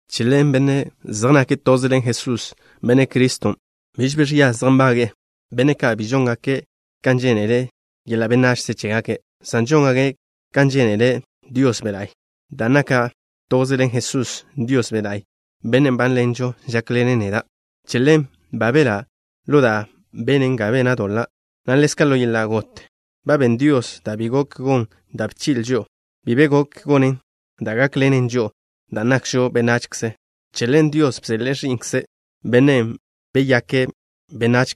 Che ḻen, benne' ka' zej nake' toze ḻen Jesús, Benne' Criston', biž bi ẕia zej nbage'e, benne' ka' biž žóngake' kan žénele yeḻa' benachze chégake', san žóngake' kan žénele Dios Be' La'y. Dan' naka' toze ḻen Jesusen', Dios Be' La'y, Bennen' nbánḻenžo, žákḻene' neda'. Che ḻen, ba belá' ḻo da' benen ga bena' doḻa', na' ḻezka' ḻo yeḻa' got. Ba ben Dios da' bi gok gon da' bchi'le' žo'o. Bi be gok gonen da' gákḻenen žo'o dan' nakžo benachze. Che ḻen Dios bseḻe'e Ẕi'nkze', Bennen' beyake' benách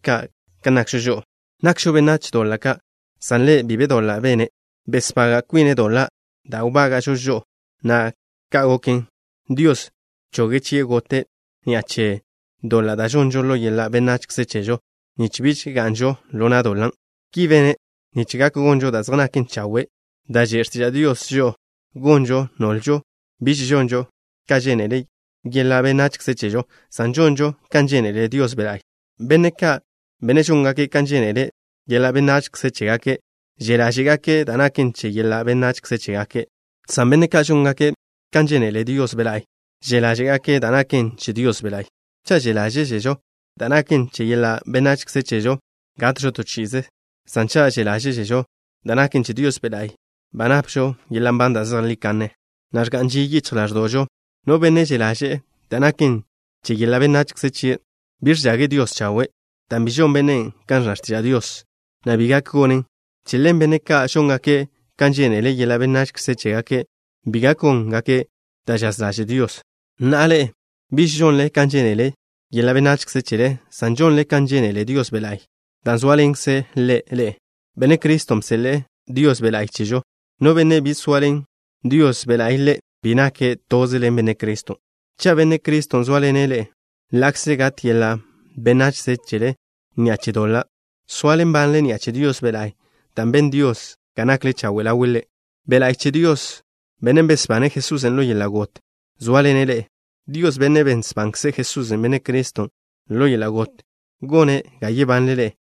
kan nakžo žo'o, nakžo benách doḻa' ka', san Ḻe' bi be doḻa' bene'. Besbaga' kwine' doḻa' da' wbága'žo žo'o, na' ka' goken, Dios bchoge' chie' gote' ni'a che doḻa' da' žonžo ḻo yeḻa' benachze chežo nich biž ga'nžo ḻo na' doḻan'. Ki bene' nich gak gonžo da' zej naken chawe' da' že' x̱tiža' Dios žo'o gonžo, nolžo biž žonžo kan žénele yeḻa' benachze chežo, san žonžo kan žénele Dios Be' La'y. Benne' ka', benne' žóngake' kan žénele yeḻa' benachze chégake', že' ḻáže'gake' da' naken che yeḻa' benachze chégake', san benne' ka' žóngake' kan žénele Dios Be' La'y, že' ḻáže'gake' da' naken che Dios Be' La'y. Cha' že' ḻáže'zežo da' naken che yeḻa' benachze chežo, gatžo to chi'ize, san cha' že' ḻáže'žo da' naken che Dios Be' La'y, ba napžo yeḻa' nban da' zejlí kanne, na' ẕga'n ži yichj ḻáẕdo'žo. No benne' že' ḻáže'ze' da' naken che yeḻa' benachze chie', bi ẕchage' Dios chawe', dan' bi žon bennen' kan ẕnna x̱tiža' Dios, na' bi gak gonen'. Che ḻen, benne' ka' žóngake' kan žénele yeḻa' benachze chégake', bi gak góngake' da' žaz ḻaže' Dios. Na'a, ḻe'e biž žonle kan žénele yeḻa' benachze chele, san žonle kan žénele Dios Be' La'y dan' zóaḻenkze' Ḻe' ḻe'e. Benne' Criston' bseḻe'e Dios Be' La'y chežo. No benne' bi zoaḻen Dios Be' La'y ḻe', bi nake' toze ḻen Benne' Criston'. Cha' Benne' Criston' zóaḻene' ḻe'e, ḻa'kze gat yeḻa' benachze chele ni'a che doḻa', soale nbanle ni'a che Dios Be' La'y dan' ben Dios ga nakle chawe' ḻawe' Ḻe'. Be' La'y che Dios, Bennen' besbane' Jesusen' ḻo yeḻa' got, zóaḻene' ḻe'e. Dios, Bennen' besbankze' Jesús, Benne' Criston', ḻo yeḻa' got, gone' ga yebanle ḻe'e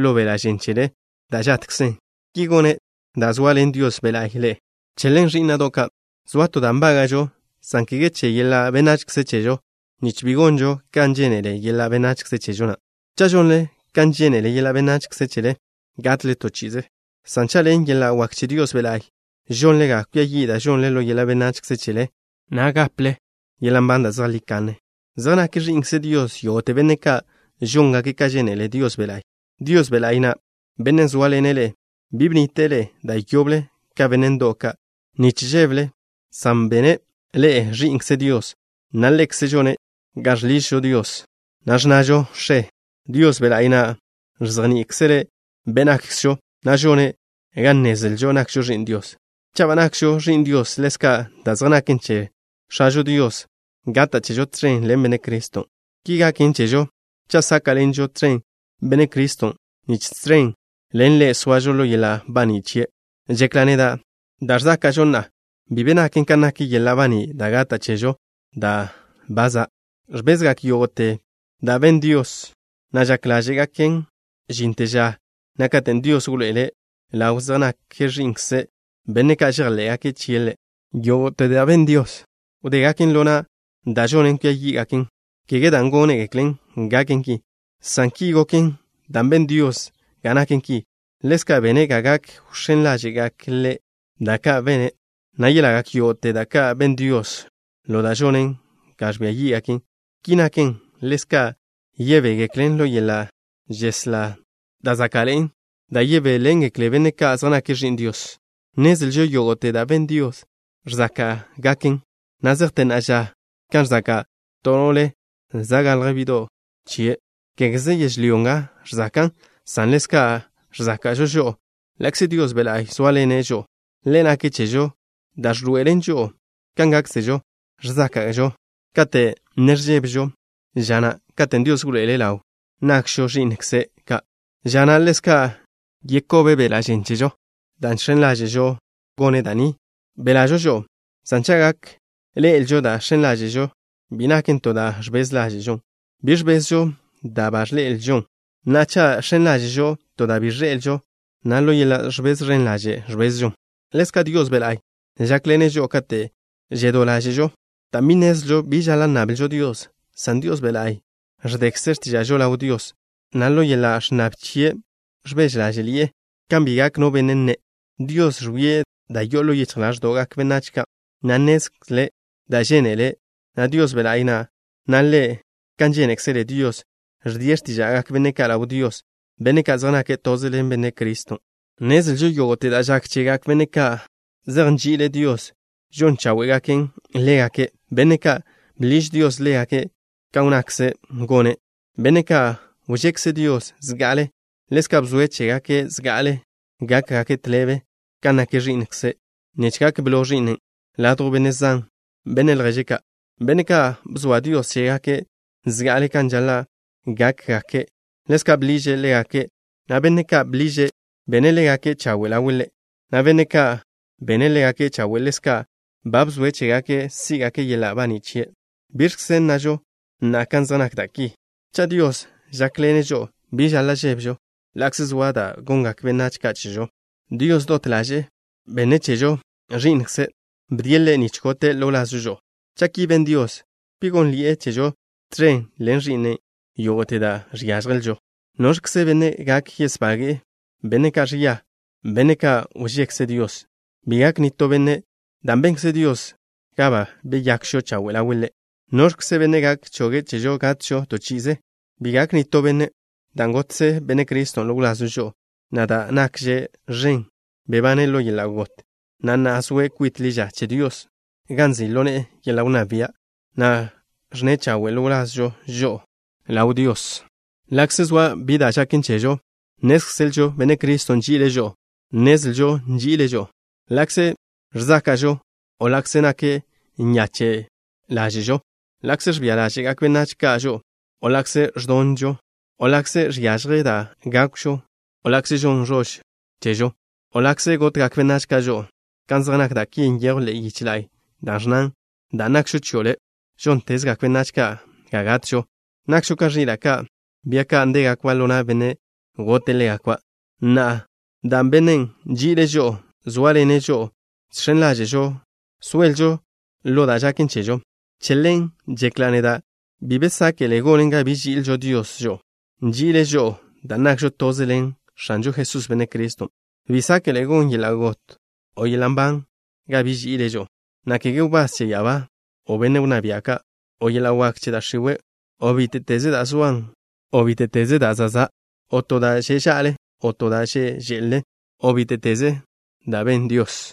ḻo beḻa' žen chele da' žatkzen. Ki gone' dan' zoaḻen Dios Be' La'y ḻe'e. Che ḻen, ẕí'na'do' ka', zoa to da' nbága'žo, san kege che yeḻa' benachze chežo, nich bi gonžo kan žénele yeḻa' benachze chežo na'. Cha' žonle kan žénele yeḻa' benachze chele, gatle to chi'ize, san cha', ḻen yeḻa' wak che Dios Be' La'y, žonle ga kwia yi' da' žonle ḻo yeḻa' benachze chele, na' gaple yeḻa' nban da' zejlí kanne. Zej nak ẕi'nkze Dios yógo'te benne' ka' žóngake' ka žénele Dios Be' La'y. Dios Be' La'y na', Bennen' zóaḻene' ḻe'e, bi bnnite'e ḻe'e da' yoble ka benne' ndo'w ka' nich žébele, san ba bene' ḻe'e ẕi'nkze Dios, na' Ḻekze' žone' ga žḻižžo Dios, na' ẕnnažo: “X̱e.” Dios Be' La'y na' ẕzejní'ikzele' be' nakkzžo, na' žone' ga nnezlžo nakžo ẕi'n Dios. Cha' ba nakžo ẕi'n Dios, ḻezka' da' zej naken che X̱ažo Dios gata' chežo tẕen ḻen Benne' Criston'. Ki gaken chežo cha' sáka'ḻenžo tẕen Benne' Criston' nich tẕen ḻen Ḻe' soažo ḻo yeḻa' baní' chie'. Žekla' neda', da' ẕzáka'žo na'a bi be naken kan nak yeḻa' baní' da' gata' chežo ža da' ba za'. Ẕbezgak yógo'te da' ben Dios, na' žak ḻáže'gaken žinte ža na' katen' Dios wḻoe'ele' ḻaw zej nak ẕi'nkze' benne' ka' žejḻé'gake' chie' Ḻe'. Yógo'te da' ben Dios wdégaken ḻo na' da' žonen ga kwia yí'gaken, kege dan' gónegeklen gaken ki, san ki goken dan' ben Dios ga naken ki. Ḻezka' bene' ga gak wx̱én ḻáže'gak Ḻe' da' ka' bene', na' yelagak yógo'te da' ka' ben Dios ḻo da' žonen ga ẕbia yí'gaken. Ki naken, ḻezka' yebégeklen ḻo yeḻa' žeslá da' záka'ḻe'en da' yebéḻengekle benne' ka' zej nake' ẕi'n Dios. Nnezlžo yógo'te da' ben Dios ẕzáka'gaken na' zejte na'a ža, kan ẕzaka' to no'le za' galj bi'do' chie'. Kégeze yežlyó nga ẕzakan', san ḻezka' ẕzáka'žo žo'o, ḻa'kze Dios Be' La'y zóaḻene' žo'o. Ḻe' nake' chežo da' ẕḻoe'elen žo'o kan gákkzežo. Ẕzáka'žo kate' ne ẕbezžo ža na' katen' Dios wḻoe'ele' ḻaw nakžo ẕi'nkze' ka', ža na' ḻezka' yeskobe' beḻa' žen chežo. Dan' žx̱en ḻáže'žo gone' da' ni, belažo žo'o, san cha' gak ḻe'elžo dan' žx̱en ḻáže'žo, bi naken to da' ẕbez ḻáže'žon. Bi ẕbezžo da' ba ẕḻe'elžon. Na'a, cha' žx̱en ḻáže'žo to da' bi ẕḻe'elžo, na' ḻo yeḻa' ẕbez ẕen ḻaže' ẕbezžon. Ḻezka' Dios Be' La'y žákḻene' žo'o kate' žedó ḻáže'žo, dan' bi nnezlžo bi žaḻa' nnablžo Dios, san Dios Be' La'y ẕdekze' x̱tíža'žo ḻaw Dios, na' ḻo yeḻa' ẕnnab chie' ẕbeže ḻáže'ḻi'e, kan bi gak no benne' nne'. Dios ẕwie' da' yo'o ḻo yichj ḻáẕdo'gak benách ka', na' nnezle' da' žénele nna Dios Be' La'y na', na' Ḻe', kan žénekzele Dios, ẕdie' x̱tíža'gak benne' ka' ḻaw Dios, benne' ka' zej nake' toze ḻen Benne' Criston'. Nnezlžo yógo'te da' žak chegak benne' ka' zej nži'ile' Dios žon cháwe'gaken ḻégake', benne' ka' bḻiž Dios ḻégake' kan wnnakze' gone'. Benne' ka' wžekze Dios zga'ale, ḻezka' bzoe' chégake' zga'ale gákgake' tḻebe kan nak Ẕi'nkze', nich gak blo Ẕi'nen' ladjw benne' zan, benne' lježe ka'. Benne' ka' bzoa Dios chégake' zga'ale kan žaḻa' gákgake', ḻezka' bḻiže' ḻégake', na' benne' ka' bḻiže', bene' ḻégake' chawe' ḻawe' Ḻe', na' benne' ka' bene' ḻégake' chawe', ḻezka' ba bzoe' chégake' sí'gake' yeḻa' baní' chie'. ¿Biẕkze nnažo na'a kan zej nak da' ki? Cha' Dios žákḻene' žo'o, bi žaḻa' žébežo ḻa'kze soa da' gongak benách ka' chežo. Dios, dot ḻaže'e benne' chežo Ẕi'nkzen'. Bdie' Ḻe' nich gote' ḻo wlazžo žo'o. Cha' ki ben Dios, ¿bi gónnḻi'e chežo tẕen ḻen Ẕi'nen' yógo'te da' žiážjelžo? ¿Noẕkze benne' gak yesbage'e benne' ka' ẕia, benne' ka' wžekze Dios? Bi gak nitó benne' dan' benkze Dios ga ba beyakžo chawe' ḻawe' Ḻe'. ¿Noẕkze benne' gak choge' chežo gatžo to chi'ize? Bi gak nitó benne' dan' gotkze Benne' Criston' ḻo wlazžo žo'o, na' da' nakže ẕen, bebane' ḻo yeḻa' got, na' na'a zoe' kwit ḻi ža che Dios gan nzi' ḻo ne'e yeḻa' wnná bia', na' ẕnne chawe'e ḻo wlazžo žo'o ḻaw Dios. Ḻa'kze zoa bi da' žaken chežo, nnézkzelžo Benne' Criston' nži'ile' žo'o. Nnezlžo nži'ile' žo'o ḻa'kze ẕzáka'žo, o ḻa'kze nak nyache' ḻáže'žo, ḻa'kze ẕbia ḻáže'gak benách ka' žo'o, o ḻa'kze ẕdonžo, o ḻa'kze žiažje da' gákwžo, o ḻa'kze žon ẕož chežo, o ḻa'kze gotgak benách ka' žo'o. Kan zej nak da' ki nyejw ḻe'e yiche la'y da' ẕnnan: Dan' nakžo chio' Le', žóntezgak benách ka' ga gatžo. Nakžo ka ẕila' ka', bia ka' ndégakba' ḻo na' benne' gote' ḻégakba'. Na'a, dan' Bennen' nži'ile' žo'o zóaḻene' žo'o, žx̱en ḻáže'žo soelžo ḻo da' žaken chežo. Che ḻen žekla' neda': Bi be sáke'le gonen ga biž ži'il Dios žo'o. Nži'ile' žo'o dan' nakžo toze ḻen X̱anžo Jesús, Benne' Criston'. Bi sáke'le gon yeḻa' got o yeḻa' nban ga biž ži'ile' žo'o, na' kege wbás che ya'abá ka', o benne' wnná bia' ka', o yeḻa' wak che da' x̱iwe', o bíte'teze da' zoan, o bíte'teze da' zan', o to da' že' ža'le, o to da' že' že'le, o bíte'teze da' ben Dios.